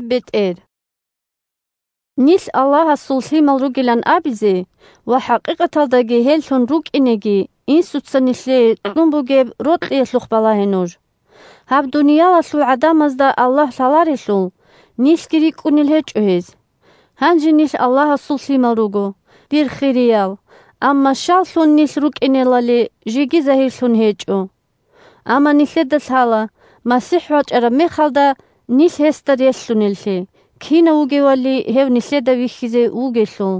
бетӀер 1Нилъ Аллагьасул лъимал ругилан абизе ва хӀакъикъаталдаги гьеллъун рукӀинеги Инсуца нилъее кьун бугеб рокьиялъухъ балагье нуж. Гьаб дуниялалъул гӀадамазда Аллагь лъаларелъул, нилъги рикӀкӀунел гьечӀо гьез. 2Гьанже нилъ Аллагьасул лъимал руго, дир хириял, амма щаллъун нилъ рукӀинелали жеги загьирлъун гьечӀо. Амма нилъеда лъала, МасихӀ вачӀараб мехалда, нилъ гьесда релълъунеллъи, кинав вугевали гьев нилъеда вихьизе вугелъул.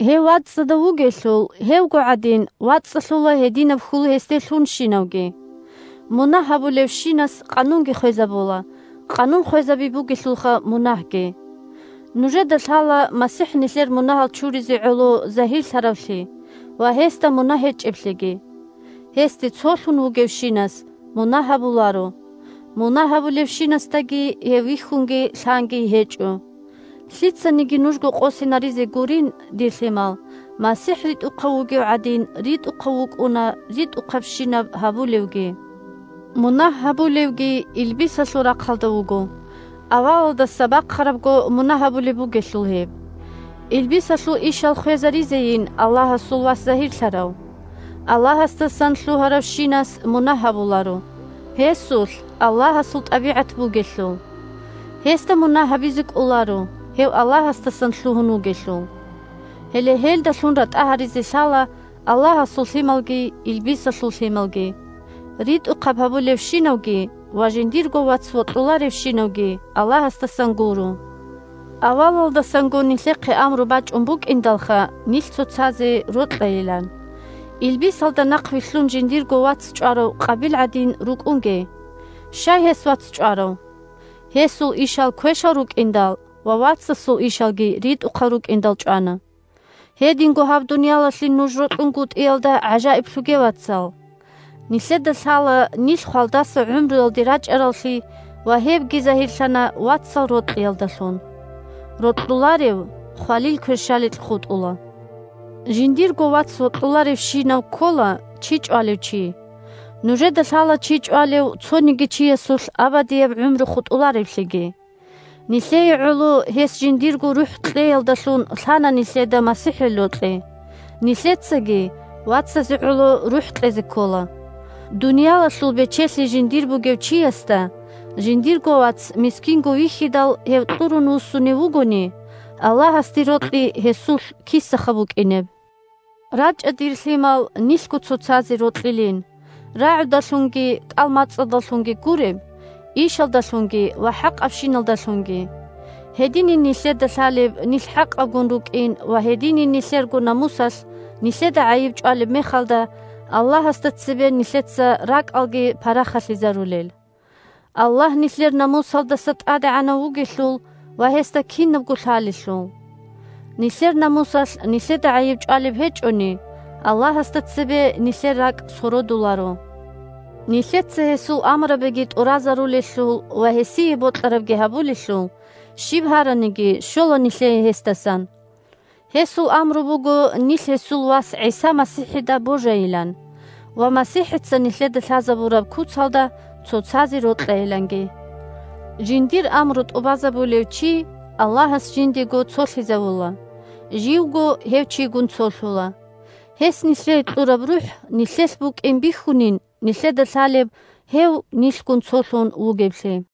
3Гьев вацӀцӀадав вугелъул, гьевго гӀадин вацӀцӀалъула гьединаб хьул гьесде лъунщинавги. Мунагь гьабулевщинас къанунги хвезабула, къанун хвезаби бугелъулха мунагьги. Нужеда лъала МасихӀ нилъер мунагьал чуризе гӀоло загьирлъаравлъи ва гьесда мунагь гьечӀеблъиги. Гьесде цолъун вугевщинас мунагь гьабуларо, мунагь гьабулевщинасдаги гьев вихьунги лъанги гьечӀо. Лъицаниги нужго къосинаризе гурин, дир лъимал: МасихӀ ритӀухъав вугев гӀадин, ритӀухъав вукӀуна ритӀухъабщинаб гьабулевги. Мунагь гьабулевги илбисалъул рахъалда вуго, авалалдаса бахъарабго мунагь гьабулеб бугелъул гьеб. Илбисалъул ишал хвезаризейин Аллагьасул Вас загьирлъарав. Аллагьасдасан лъугьаравщинас мунагь гьабуларо, гьесулъ Аллагьасул тӀабигӀат бугелъул. Гьесда мунагь гьабизе кӀоларо, гьев Аллагьасдасан лъугьун вугелъул. Гьеле гьелдалъун ратӀа гьаризе лъала Аллагьасул лъималги илбисалъул лъималги: ритӀухъаб гьабуларевщинавги ва жиндирго вац вокьуларевщинавги Аллагьасдасан гуро. Авалалдасанго нилъехъе амру бачӀун букӀиндалха нилъ цоцазе рокьайилан. Илбисалда нахъвилълъун жиндирго вац чӀварав Къабил гӀадин рукӀунге. Щай гьес вац чӀварав? Гьесул ишал квешал рукӀиндал ва вацасул ишалги ритӀухъал рукӀиндал чӀвана. Гьединго гьаб дуниялалъе нуж рокьунгутӀиялда гӀажаиблъуге, вацал. Нилъеда лъала нилъ хвалдаса гӀумруялде рачӀараллъи ва гьебги загьирлъана вацал рокьиялдалъун. Рокьуларев – хвалил кверщаликь хутӀула. Жиндирго вац вокьуларевщинав ккола чи чӀвалев чи. Нужеда лъала чи чӀвалев цониги чиясулъ абадияб гӀумру хутӀулареблъиги. Нилъее гӀоло гьес жиндирго рухӀ кьеялдалъун лъана нилъеда МасихӀил рокьи, нилъецаги вацазе гӀоло рухӀ кьезе ккола. Дуниялалъул бечелъи жиндир бугев чиясда жиндирго вац мискинго вихьидал гьев кьурун вуссунев вугони, Аллагьасде рокьи гьесулъ кисаха букӀинеб? РачӀа, дир лъимал, нилъго цоцазе рокьилин, рагӀудалъунги кӀал-мацӀалдалъунги гуреб, ишалдалъунги ва хӀакъабщиналдалъунги. Гьединин нилъеда лъалеб нилъ хӀакъабгун рукӀин ва гьединин, нилъерго намусалъ нилъеда гӀайиб чӀвалеб мехалда, Аллагьасда цебе нилъеца ракӀалги парахалъизарулел. Аллагь нилъер намусалдаса тӀадегӀанав вугелъул ва гьесда кинабго лъалелъул! Нилъер намусалъ нилъеда гӀайиб чӀвалеб гьечӀони, Аллагьасда цебе нилъер ракӀ сородуларо. Нилъеца гьесул амрабиги тӀуразарулелъул ва гьесие бокьарабги гьабулелъул, щиб гьараниги щола нилъее гьесдасан. Гьесул амру буго нилъ гьесул вас ГӀиса МасихӀида божайилан ва МасихӀица нилъеда лъазабураб куцалда цоцазе рокьайиланги. Жиндир амру тӀубазабулев чи Аллагьас жиндего цолъизавула, живго гьев чигун цолъула. Гьес нилъее кьураб РухӀ нилъелъ букӀин бихьунин нилъеда лъалеб гьев нилъгун цолъун вугевлъи.